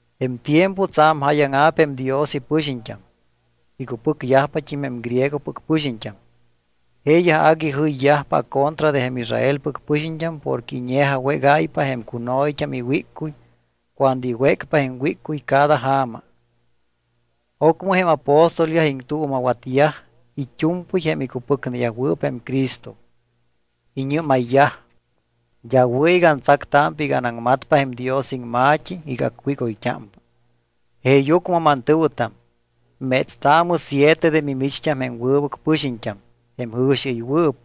Jém tiempo tsa̱m jáyaŋa̱p jém Dios ipɨxiñt́am. Icupɨcyajpat́im jém griegopɨc pɨxiñt́am. Jeeyaj agui jɨyyajpa acontra de jém Israelpɨc pɨxiñt́am porque iñe̱jawégáypa jém cuno̱yt́am iwíccuy cuando iwécpa jém wíccuy cada ja̱ma. Ocmɨ jém apóstolyaj iŋtuuma̱watyaj it́u̱mpɨy jém icupɨcneyajwɨɨp jém Cristo. Iñɨ́mayyaj: —D́a wɨ̱ iga antsactámpa iga anaŋmatpa jém Dios iŋma̱t́i iga acwígoyt́ámpa. Jeeyucmɨ mantɨ̱wɨtam, métstaamɨ siete de mimicht́am jém wɨbɨc pɨxiñt́am, jém jɨ̱xiɨywɨɨp,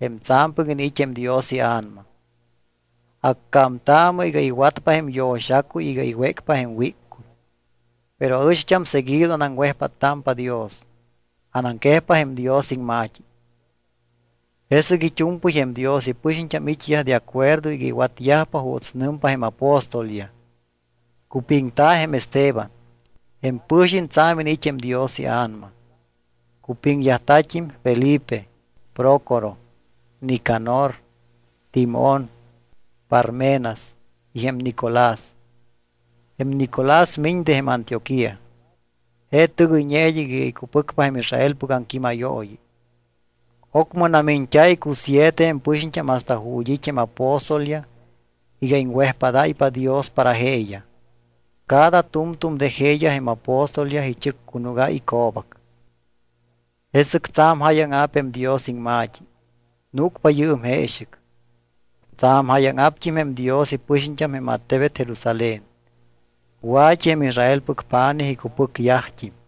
jém tsa̱mpɨc iniit́ jém Dios iA̱nama. Accámtaamɨ iga iwatpa jém yo̱xacuy iga iwécpa jém wíccuy. Pero aɨcht́am seguido anaŋwejpáttámpa Dios, anaŋquejpa jém Dios iŋma̱t́i. Jesɨc it́u̱mpɨy jém Dios ipɨxiñt́am it́yaj de acuerdo iga iwatyajpa juuts nɨmyaj jém apóstolyaj. Cupiŋta̱ jém Esteban. Jém pɨ̱xiñ tsa̱m iniit́ jém Dios iA̱nama. Cupiŋyajta̱t́im Felipe, Prócoro, Nicanor, Timón, Parmenas y jém Nicolás. Jém Nicolás miñ de jém Antioquía. Je tɨgɨyñe id́ɨc iga icupɨcpa jém Israelpɨc aŋquímayooyi. Ocmɨ namiñt́a̱ icusiete jém pɨxiñt́am hasta ju̱t́ it́ jém apóstolyaj iga iŋwejpádáypa Dios para jeeyaj. Cada tu̱mtu̱m de jeeyaj jém apóstolyaj ichɨccunúgáy ico̱bac. Jesɨc tsa̱m jáyaŋa̱p jém Dios iŋma̱t́i, núcpa yɨɨm jeexɨc. Tsa̱m jáyaŋa̱pt́im jém Dios ipɨxiñt́am jém attebet Jerusalén. Wa̱t́i jém Israelpɨc pa̱nij icupɨcyajt́im.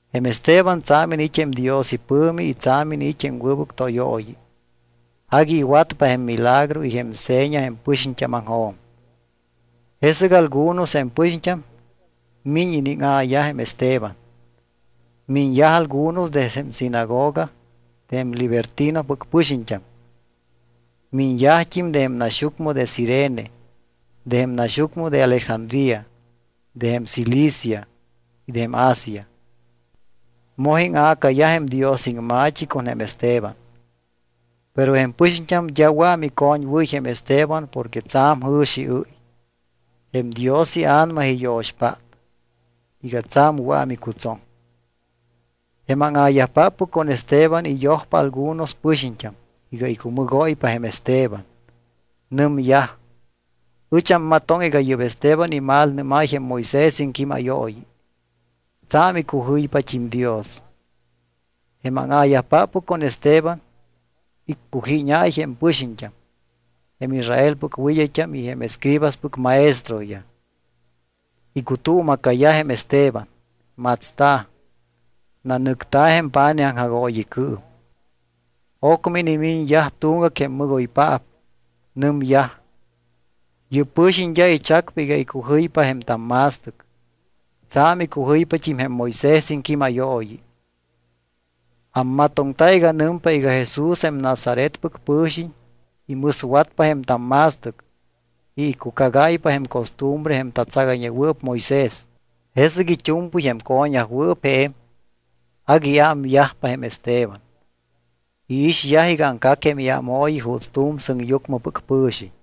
Jém Esteban tsa̱m iniit́ jém Dios ipɨ̱mi y tsa̱m iniit́ jém wɨbɨc tóyooyi. Agui iwatpa jém milagro y jém seña jém pɨxiñt́ámaŋjo̱m. Jesɨc algunos jém pɨxiñt́am miñ iníŋa̱yaj jém Esteban. Miñyaj algunos de jém sinagoga de jém Libertinopɨc pɨxiñt́am. Miñyajt́im de jém naxyucmɨ de Cirene, de jém naxyucmɨ de Alejandría, de jém Cilicia y de jém Asia. Moj íŋa̱cayaj jém Dios iŋma̱t́i con jém Esteban. Pero jém pɨxiñt́am d́a wɨa̱ micoñwɨ́y jém Esteban porque tsa̱m jɨ̱xiɨ́y. Jém Dios iA̱nama iyo̱xpát iga tsa̱m wɨa̱ micutsoŋ. Jém áŋa̱yajpáppɨc con Esteban iyojpa algunos pɨxiñt́am iga icumɨgóypa jém Esteban. Nɨmyaj: —Ɨch ammatoŋ iga yɨ́p Esteban imalnɨ́máy jém Moisés iŋquímayooyi. Tsa̱m icujɨypat́im Dios. Jém áŋa̱yajpáppɨc con Esteban iccujíñáy jém pɨxiñt́am, jém Israelpɨc wɨd́ayt́am y jém escribaspɨc maestroyaj. Icutuuma̱cayaj jém Esteban, matsta̱, nanɨcta̱ jém pa̱nij aŋjagooyicɨɨm. Ocmɨ inimiñyaj tuŋgac jém mɨgoypaap. Nɨmyaj: —Yɨ́p pɨ̱xiñ d́a ichacpa iga icujɨypa jém tamma̱stɨc. Tsa̱m icujɨypat́im jém Moisés iŋquímayooyi. Ammatoŋta iga nɨmpa iga Jesús jém Nazaretpɨc pɨ̱xiñ imɨswatpa jém tamma̱stɨc y icucagáypa jém costumbre jém tatsagayñewɨɨp Moisés. Jesɨc it́u̱mpɨy jém co̱ñyajwɨɨp je̱m, agui iámyajpa jém Esteban. Iixyaj iga aŋcac jém iámooyi juuts tu̱m sɨŋyucmɨpɨc pɨ̱xiñ.